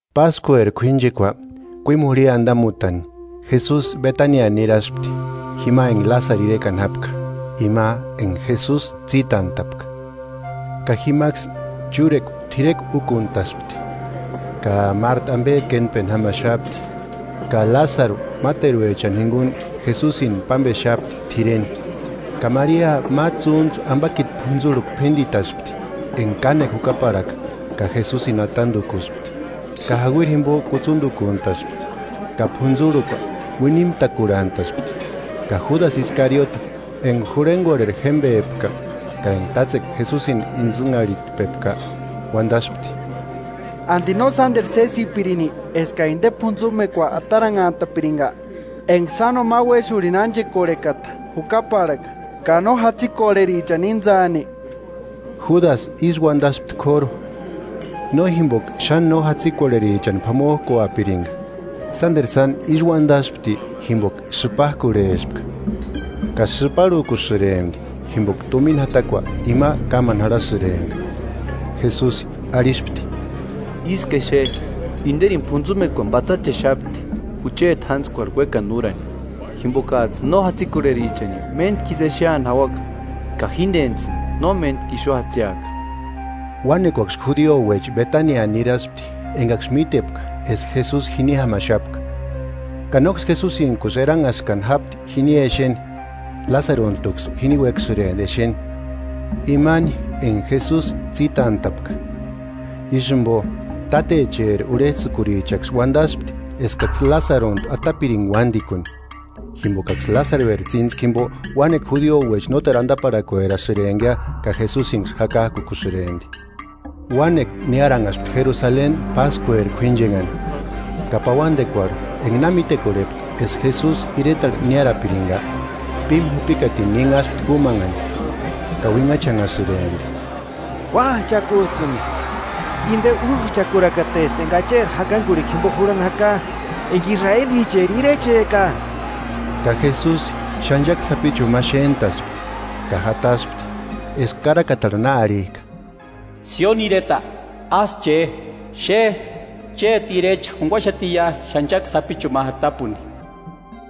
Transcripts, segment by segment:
Páskueri k'uínchekua kuímu jurhia andamutani, Jesusi Betania niraspti, jima enga Lásaru irekani jápka, ima enga Jesusi tsítantapka. Ka jimaksï chúrekua t'irekua úkuntaspti; ka Marta ambe kéntpeni jámaxapti, ka Lásaru máteruechani jinguni Jesusini pámbexapti t'ireni. Ka Maria ma tsúntsu ambakiti p'untsurhukua p'índitaspti, enga kánekua jukaparhaka, ka Jesusini atandukuspti; ka jauiri jimbo kutsundukuntaspti. Ka p'untsurhukua uinimtakurhantaspti. Ka Júdasï Iskariote, enga jurhengorheri jémbepka, ka enga tátsekua Jesusini intsïnharhitpepka, uandaspti: 5–¿Andi no sánderu sésipirini eska inde p'untsumekua ataranhantapiringa, enga sáno ma uéxurhini ánchekorhekata jukaparhaka, ka no jatsikorherichani íntsani? Júdasï ísï uandaspti k'óru, no jimboka xáni no jatsikorherichani p'amojkuapiringa, sánderu sáni ísï uandaspti jimboka sïpajkurhespka, ka sïparhukusïrempti jimboka tumina jatakua ima kámani jarhasïrempka. Jesusi arhispti: –Isku exe, inderini p'untsumekuani patsachexapti jucheti jántskuarhu uékani úrani. Jimbokajtsï no jatsikorherichani méntkisï exeani jauaka, ka jíndenijtsïni no méntku ixu jatsiaka. Uánekuaksï judiouecha Betania niraspti engaksï mítepka eska Jesusi jini jámaxapka, ka nóksï Jesusintkusï eranhaskani jápti jini exeni, Lásaruntuksï jini uéksïrempti exeni, imani enga Jesusi tsítantapka. Ísï jimbo, tátecheri urhejtsïkurichaksï uandaspti eskaksï Lásaruntu atapiringa uándikuni. Jimbokaksï Lásarueri tsíntskua jimbo uánekua judiouecha nóteru andaparhakuerasïrempkia ka Jesusinksï jakajkukusïrempti. Uánekua niáranhaspti Jerusaleni páskueri k'uínchenhani, ka pauandekuarhu enga na mítekorhepka eska Jesusi iretarhu niárapiringa, pímu jupikatini ninhaspti kúmanhani, ka uinhachanhasïrempti: –¡Kuájchakujtsïni! ¡Inde újchakurakatesti enga Acheri jakangurhikua jimbo jurhani jaka, enga israelicheri Irecheka! Ka Jesusi ch'anchaki sapichuni ma xéntaspti ka jataspti, eska karakatarhu na arhijka: “Sioni ireta, ásï che; xe chéti Irecha jurhaxatiia ch'anchaki sapichuni ma jatapuni”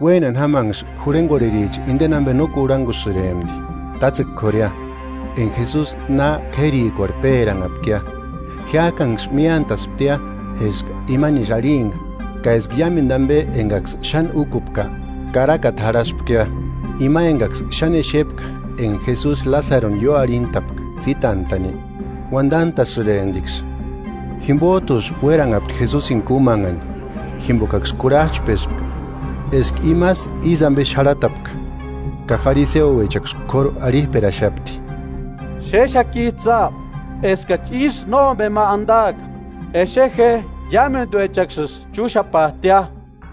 Uénani jámanksï jurhengorhericha indeni ambe no kurhangusïrempti, tátsekua k'ória, enga Jesusi na k'érikuarhu péranhapkia, jiájkanksï míantasptia eska imanisï arhimpka, ka eska iámendu ambe engaksï xáni úkupka, karakata jarhaspkia. Ima engaksï xáni exepka enga Jesusi Lásaruni ióarhintapka tsítantani, uandantasïremptiksï. Jimbojtusï uéranhapti Jesusini kúmanhani, jimbokaksï kurhajchpespka eska imasï ísï ambe xarhatapka. Ka fariseouechaksï k'óru arhijperaxapti: –Xéxakijtsïa eskachi ísï nómbema andaaka. Exe je ¡Iámenduechaksïsï chúxapajtia!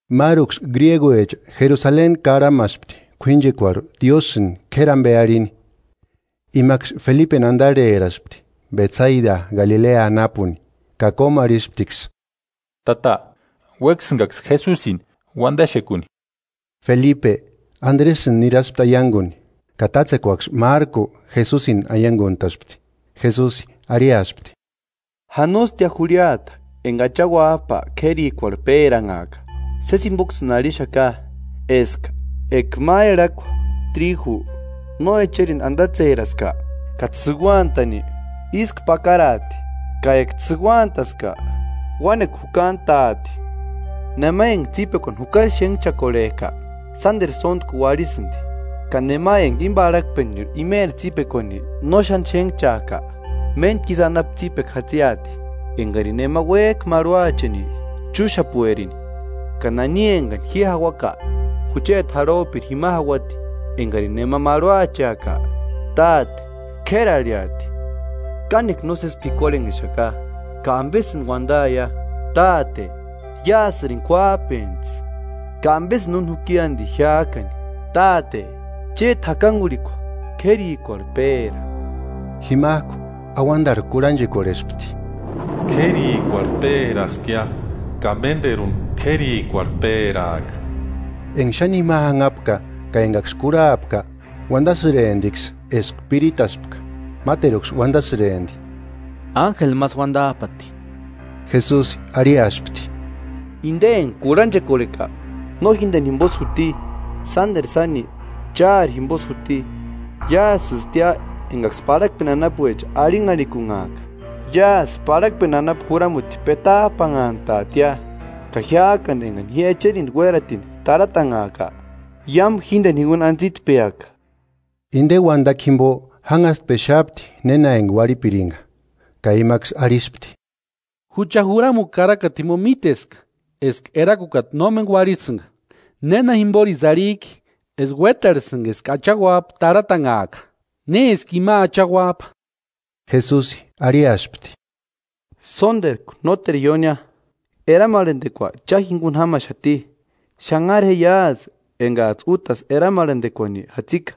Máruksï griéguecha Jerusaleni karhamaspti k'uínchekuarhu Diósïni k'éri ambe arhini. Imaksï Felipeni andarheraspti, Betsaida Galilea anapuni, ka kómuarhisptiksï: –Tata, uéksïngaksï Jesusini uandaxekuni. Felipe, Andresïni niraspti aianguni; ka tátsekuaksï márku, Jesusini aianguntaspti. Jesusi arhiaspti: –Janostia jurhiata enga Acha Uájpa k'érikuarhu péranhaaka. Sési jimboksïni arhixaka, eska eka ma erhakua tríju no echerindu andatseraska ka tsïuantani, ísku pakaraati; ka eka tsïuantaska, uánekua jukantaati. Nema enga tsípekuani jukari xénhchakorhejka, sánderu sóntku uarhisïndi; ka nema enga íni parhakpenirhu imeri tsípekuani no xáni xénhchajka, méntku isï anapu tsípekua jatsiati. Engarini nema uéjka marhuacheni, chúxapuerini, ka nani engani ji jauaka, jucheti jarhojpiri jima jauati. Ekarini nema marhuacheaka, Táte, k'éri arhiati. “Kánekua nósesi p'ikuarhenhexaka. Ka ¿Ambesïni uandaia? ‘¡Táte, iásïrini kuájpentsï!’ ¡Ka ambesïni úni juki andi jiájkani! Táte, chéti jakangurhikua k'érikuarhu péra.” Jimajku auandarhu kurhanchekorhespti: “K'érikuarhu péraskia ka ménderuni k'érikuarhu péraaka.” Enga xáni jima janhapka ka engaksï kurhapka uandasïremptiksï eska piritaspka. Máteruksï uandasïrempti: –Ánjeli másï uandajpati. Jesusi arhiaspti: Inde enga kurhanchekorheka no jíndeni jimbosï juti, sánderu sáni chári jimbosï juti. Iásïstia engaksï parhakeni anapuecha arhinharhikunhaaka; iásï parhakpeni anapu juramuti petajpanhantaatia. Ka jiájkani engani ji echerindu uératini tarhatanhaaka, iámu jíndeni jinguni antsitpeaka. Inde uandakua jimbo jánhastpexapti néna enga uarhipiringa. Ka imaksï arhispti: “Jucha juramukua karakata jimbo míteska eska Erakukata nómeni uarhisïnga. ¿Néna jimborisï arhijki eska uétarhesïnga eska Acha Uájpa tarhatanhaaka? ¿Néski ima Acha Uájpa?” Jesusi arhiaspti: “Sónderku, nóteru iónia, eramarhandekua cha jinguni jámaxati. Xánhara je iásï engajtsï útasï eramarhandekuani jatsika,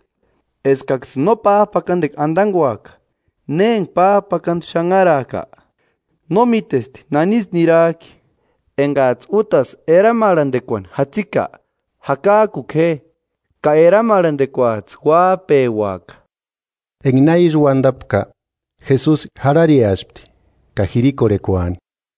eskaksïni no pájpakandekua andanguaka; ne enga pájpakandu xanharajka, no mítesti nanisï nirajki. Engajtsï útasï eramarhandekuani jatsika jakajkuku je, ka eramarhandekuajtsï uájpeuaka.” Enga na ísï uandapka, Jesusi jarhareaspti ka jirikorhekuani.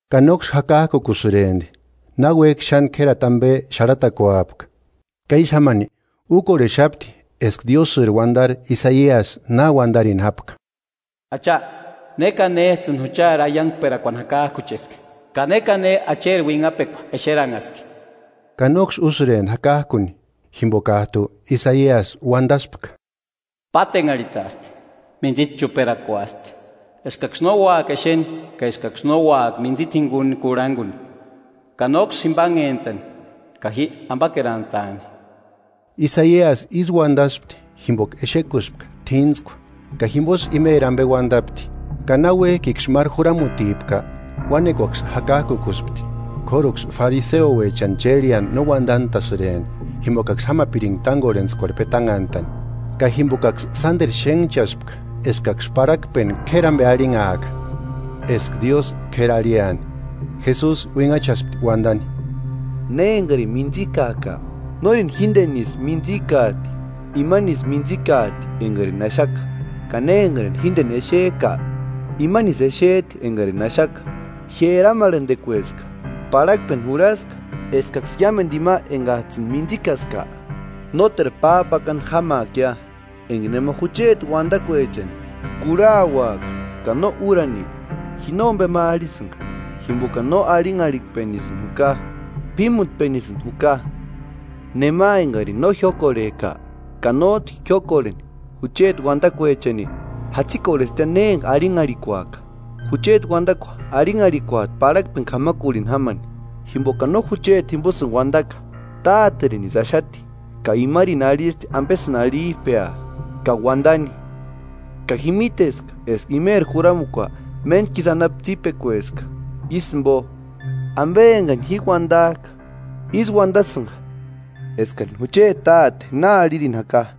Ka nóksï jakajkukusïrempti, náuejki xáni k'érati ambe xarhatakuapka; ka ísï jámani úkorhexapti eska Diósïri uandari Isaiasï na uandarini jápka: Acha, ¿Ne ka néjtsïni juchari aiangperakuani jakajkucheski? Ka ¿Ne ka ne Acheri uinhapekua exeranhaski? Ka nóksï úsïrempti jakajkuni, jimbokajtu Isaiasï uandaspka: Pátenharhitaasti, mintsita chuperakuasti; eskaksï no úaka exeni, ka eskaksï no úaka mintsita jinguni kurhanguni, ka nóksï jimbanhentani, ka ji ambakerantaani. Isaiasï ísï uandaspti jimboka exekuspka t'íntskua ka jimbosï imeri ambe uandapti. Ka náuejkiksï máru juramutipka, uánekuaksï jakajkukuspti, k'óruksï fariseuechani chérheani no uandantasïrempti jimbokaksï jámapiringa tángorhentskuarhu petanhantani. Ka jimbokaksï sánderu xénhchaspka eskaksï parhakpeni k'éri ambe arhinhaaka, eska Diósï k'éri arhiani. Jesusi uinhachaspti uandani: “Ne engarini mintsikajka, nórini jíndenisï mintsïkajti, imanisï mintsïkajti engarini axaka; ka ne engarini jíndeni exejka, imanisï exejti engarini axaka. Ji eramarhendekueska, parhakpeni jurhaska eskaksï iámendu ima engajtsïni míntsïkaska nóteru pájpakandu jámaakia. Enga nema jucheti uandakuechani kurhauaaka ka no úraani, ji nómbema arhisïnga, jimbokani no arhianharhikpenisïni juka, p'ímutpenisïni juka. Nema engarini no jiókorhejka ka nójtu jiókorheni jucheti uandakuechani, jatsikorhestia ne enga arhinharhikuaka: Jucheti uandakua arhinharhikuati parhakpeni k'amarhuni jámani jimbokani no jucheti jimbosïni uandaka, Táterinisï axati, ka imarini arhisti ambesïni arhijpea ka uandani, ka ji míteska eska imeri juramukua méntkisï anapu tsípekueska. Ísï jimbo, ambe engani ji uandajka ísï uandasïnga eskarini jucheti Táte na arhirini jaka.”